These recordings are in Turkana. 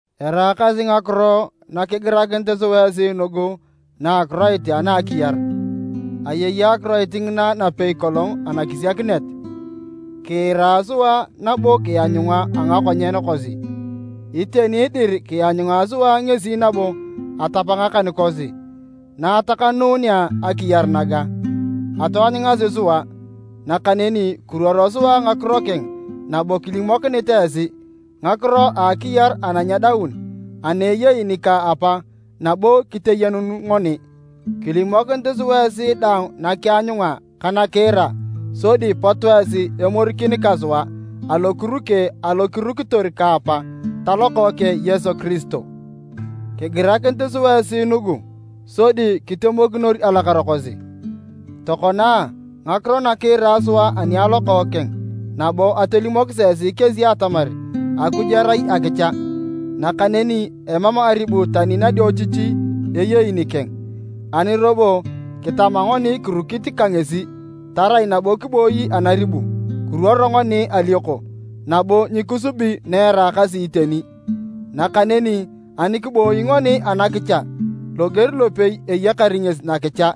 Eraakasi ngakiro na kigirakinit sua esi nugu na a Akiroit ana a Akiyar. Ayei Akiroit ngina napei kolong anakisiakinet. Kiira sua nabo kianyunga a ngakonyen kosi. Iteni dir, kianyunga sua ngesi nabo atap ngakan kosi. Na atakanuunea akiyar naga, ataanyungasi sua. Nakaneni kiruoro sua ngakiro keng nabo kilimokinit esi ngakiro a akiyar ana nyedaun ana ayei nika Apa nabo kiteyenun ngoni. Kilimokinit sua esi dang nakianyunga ka nakiira sodi pot esi emorikin ka sua alokuruke alo kirukitor ka Apa ta Lokookeng Yesu Kiristo. Kigirakinit sua esi nugu sodi kitemokinor alakara kosi. Tokona, ngakiro na kiira sua ani a Lokookeng nabo atolimokisi esi kesi atamar Akuj erai akicha, nakaneni emam aribu tani nadiochichi eyei nikeng. Ani robo kitama ngoni kirukit ka ngesi, tarai nabo kiboi anaribu, kiruoro ngoni alioko nabo nyikisubi na eraakasi iteni. Nakaneni ani kiboi ngoni anakicha, loger lopei eyakar ngesi nakicha,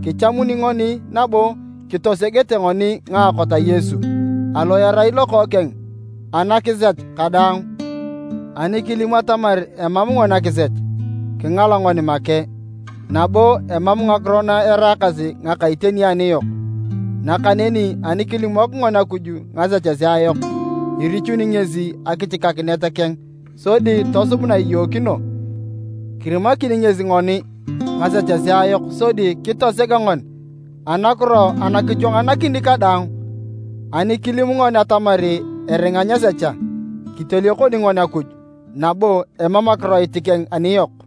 kichamun ngoni, nabo kitosegete ngoni ngaakot a Yesu, alo erai Lokookeng, anakisech kadaang. Ani kilim atamar emam ngoni akisech, kingala ngoni make, nabo emam ngakiro na eraakasi ngaka iteni aniyok. Nakaneni ani kilimok ngoni Akuj ngasechesea yok, irichuni ngesi akichikakinet keng sodi tosub na iyookino, kirimakini ngesi ngoni ngasechesea yok sodi kitoseg ngoni anakiro ana kichwanganakini kadaang. Ani kilim ngoni atamar eringa nyesecha, kiteliokon ngoni Akuj, nabo emam akiroit keng aniyok.